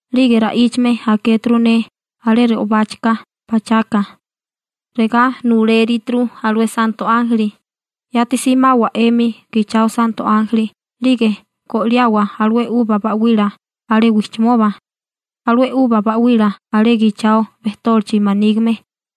'Lige ra'íchame akéturu ne alé re'obáchika pachaka, regá nulérituru alué santo ánjeli: ―Yati simawa 'emi gichao santo ánjeli 'lige go'liawa alué 'uba ba'wila alé wijchimoba, alué 'uba ba'wila alé gichao bejtólichi manígime.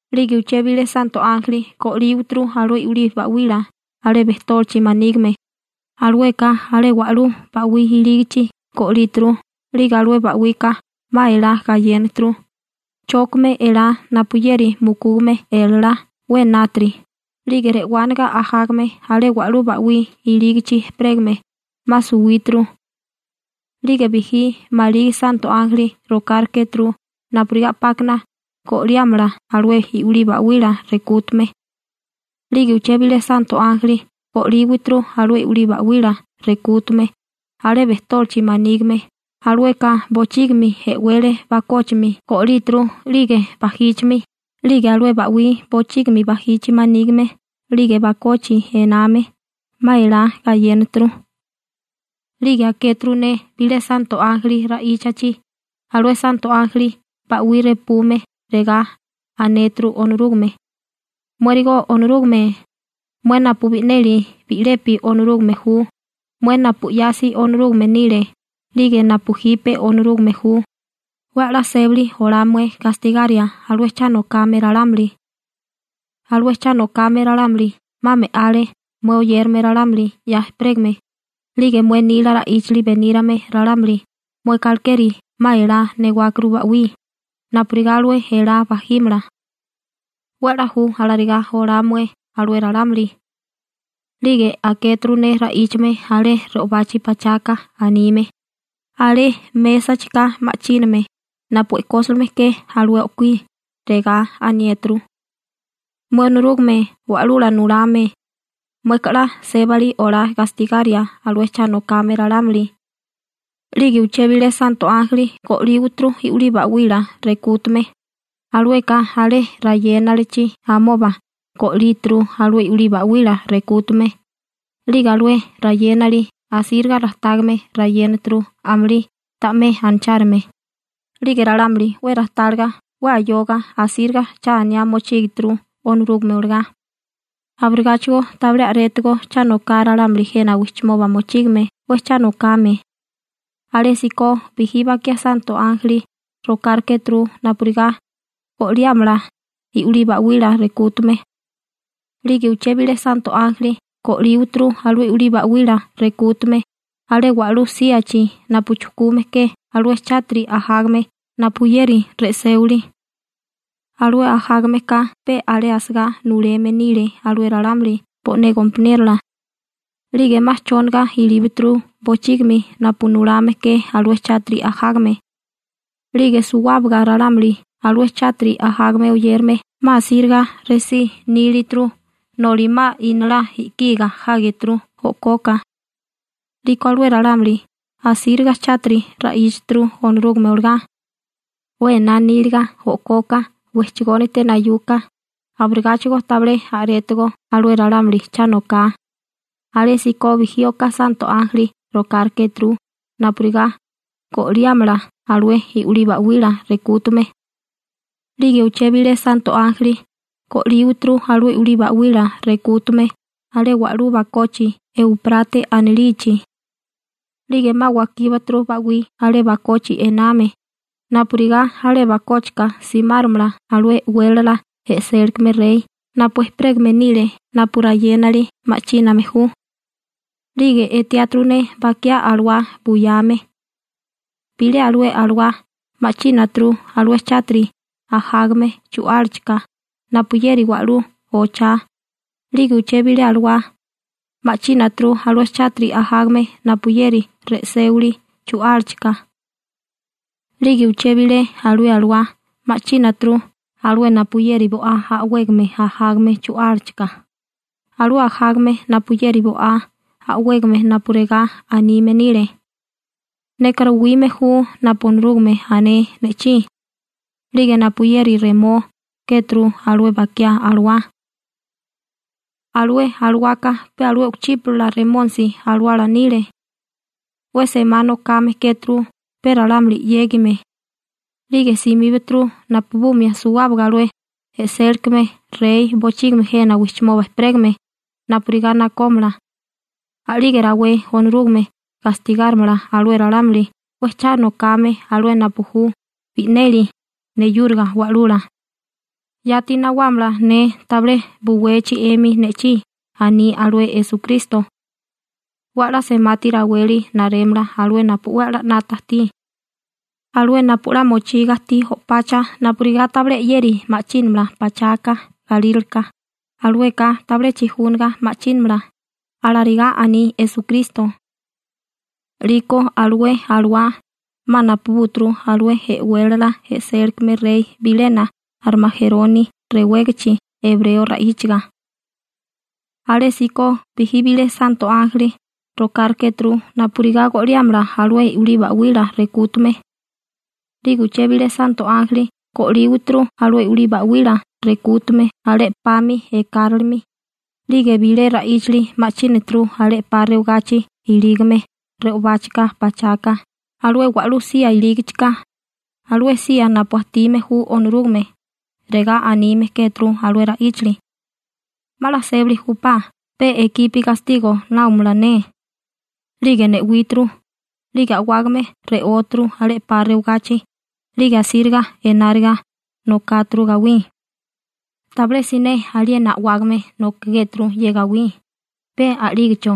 'Lige uché bilé santo ánjeli go'líturu alué i'wilí ba'wila alé bejtólichi manígime, alueka alé wa'lú ba'wí ilígichi go'líturu, 'lige alué ba'wika 'ma elá gayénaturu, chókame elá napuyeri mukúgame elalá 'we enátiri 'lige re'wániga ajágame alé wa'lú ba'wí ilígichi ejperégame 'ma suwíturu. 'Lige bijí maligi santo ánjeli rokárikéturu napurigá 'pákana go'liámala alué i'wilí ba'wila rekútume. 'Lige uché bilé santo ánjeli go'líturu alué i'wilí ba'wila rekútume alé bejtólichi manígime, alueka bochígimi e'wele bakóchimi go'líwituru 'lige bajíchimi. 'Lige alué ba'wí bochígimi bajichi manígime 'lige bakochi ename 'ma elá gayénaturu. 'Lige akéturu ne bilé santo ánjeli ra'íchachi, alué santo ánjeli ba'wí repume, regá anéturu Onorúgame: ―Muérigo Onorúgame, mué napu bi'neli bi'lepi Onorúgame ju, mué napu 'yasi Onorúgame nile 'lige napu jipe Onorúgame ju, 'we 'la sébali olá mué gastigaria alué cha nokame ralámuli. Alué cha nokame ralámuli 'ma me'ale mué oyérame ralámuli 'ya ejperégame, 'lige mué nila ra'íchali benírame ralámuli mueka, alekeri 'ma elá newákuru ba'wí napurigá alué elá bajímala, 'we 'la ju alarigá olá mué alué ralámuli. 'Lige akéturu ne ra'íchame alé re'obachi pachaka anime, alé mésachika ma'chíname napu e'kósilime ke alué o'kuí, regá aniéturu: ―Mué Onorúgame Wa'lula Nulame, mueka 'la sébali olá gastigaria alué cha nokame ralámuli. 'Lige uché bilé santo ánjeli go'líturu i'wilí ba'wila rekútume, alueka alé rayénalichi amoba go'líturu alué i'wilí ba'wila rekútume, 'lige alué rayénali asíriga rajtágame rayénaturu amulí ta'mé anachárume. 'Lige ralámuli 'we rajtáliga, 'we ayoga, asíriga cha aniá mochígituru Onorúgame olagá. Abirigáchigo tabilé a'rétigo cha noká ralámuli jena wijchimoba mochígame 'we cha nokame. Alésíko bijí bakiá santo ánjeli rokárikéturu napurigá go'liámala i'wilí ba'wila rekútume. 'Lige uché bilé santo ánjeli go'líturu alué i'wilí ba'wila rekútume alé wa'lú síachi napu chujkume ke alué chátiri ajágame napuyeri re'séwili. Alué ajágame ka pe alé asagá nuleme nile alué ralámuli bo'né gompaniérola. 'Lige 'ma chóniga ilíbaturu bochígimi napu nulame ke alué chátiri ajágame. 'Lige suwábaga ralámuli alué chátiri ajágame oyérame 'ma asíriga resí nílituru noli 'ma inalá i'kiga jágeturu o'koka. 'Liko alué ralámuli asíriga chátiri ra'íchaturu Onorúgame olagá, 'we ená níliga o'koka wejchagónite nayuka, abirigáchigo tabilé a'rétigo alué ralámuli cha noká. Alésíko bijí oká santo ánjeli rokárikéturu napurigá go'liámala alué i'wilí ba'wila rekútume. 'Lige uché bilé santo ánjeli go'líturu alué i'wilí ba'wila rekútume alé wa'lú bakochi Euprate anilichi, 'lige 'ma wakíbaturu ba'wí alé bakochi ename, napurigá alé bakóchika simáromala alué e'wélala e'sélikame rey napu ejperégame nile napu rayénali ma'chíname ju. 'Lige etiáturu ne bakiá alawá buyame. Bilé alué alawá ma'chínaturu alué chátiri ajágame chu'álachika napuyeri wa'lú ochá, 'lige uché bilé alué alawá ma'chínaturu alué chátiri ajágame napuyeri re'séwili chu'álachika. 'Lige uché bilé alué alawá ma'chínaturu alué napuyeri bo'á a'wégame ajágame chu'álachika, alué ajágame napuyeri bo'á a'wégame napu regá anime nile: «Neka ruwime ju napu Onorúgame ané ne'chí.›› 'Lige napuyeri remó kéturu alué bakiá alawá. Alué alawaka pe alué u'kuchípala Remónisi alawala nile 'we semá nokame kéturu pe ralámuli 'yégime, 'lige simíbaturu napubumia suwábaga alué e'sélikame rey bochígimi jena wijchimoba ejperégame napurigá nakómala. A'lige rawé Onorúgame gastigárimala alué ralámuli 'we cha nokame, alué napu ju bi'neli neyúriga Wa'lula. «Yati nawámala ne tabilé buwechi 'emi ne'chí», aní alué Esukristo. «'We 'la semati raweli narémala alué napu 'we 'la 'nata ajtí. Alué napu 'la mochiga ajtí o'pacha napurigá tabilé 'yeri ma'chínamala pachaka galíraleka, alueka tabilé chijúniga ma'chínamala», alarigá aní Esukristo. 'Liko alué alawá 'ma napubúturu alué e'wélala e'sélikame rey bilena Armajeroni rewégichi ebreo ra'íchaga. Alésíko bijí bilé santo ánjeli rokárikéturu napurigá go'liámala alué i'wilí ba'wila rekútume. 'Lige uché bilé santo ánjeli go'líturu alué i'wilí ba'wila rekútume alé 'pami ekáralimi, 'lige bilé ra'íchali ma'chínaturu alé 'pa rewagachi ilígame re'obáchika pachaka alué wa'lú sía ilígichika, alué sía napu ajtime ju Onorúgame, regá anime kéturu alué ra'íchali: ―'Ma 'la sébali júpá, pe ekipi gastigo náomala ne. 'Lige ne'wíturu, 'lige a'wágame re'óturu alé 'pa rewagachi, 'lige asíriga enáriga nokáturu gawí. Tabilé siné aliena a'wágame nokigéturu ye gawí, pe a'lígecho.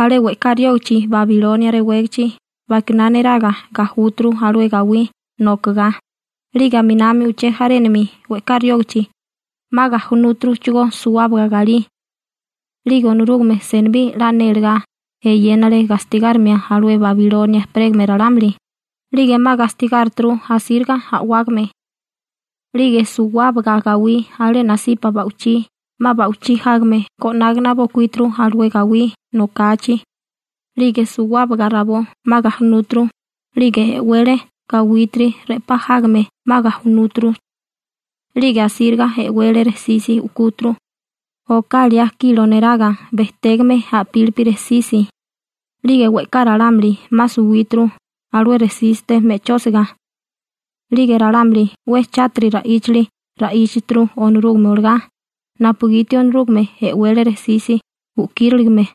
Alé we'ká riógichi Babilonia rewégichi bakiná neraga gajúturu alué gawí nokagá, 'lige aminami uché jarénami we'ká riógichi 'ma gajunúturuchigó suwábaga galí. 'Lige Onorúgame senibí 'la nélegá eyénale gastigárimia alué Babilonia ejperégame ralámuli, 'lige 'ma gastigárituru asíriga a'wágame. 'Lige suwábaga gawí alé nasipa ba'wichí 'ma ba'wichí jágame go'nágana bokuíturu alué gawí nokachi, 'lige suwábaga rabó 'ma gajunúturu, 'lige e'wele gawítiri re'pá jágame 'ma gajunúturu. 'Lige asíriga e'wele rejsisi u'kúturu, oká liá kilo neraga bejtégame a'pílipi rejsisi, 'lige we'ká ralámuli 'ma suwíturu alué rejsísite me'chósiga. 'Lige ralámuli 'we chátiri ra'íchali ra'íchaturu Onorúgame olagá, napugiti Onorúgame e'wele rejsisi u'kíriligame.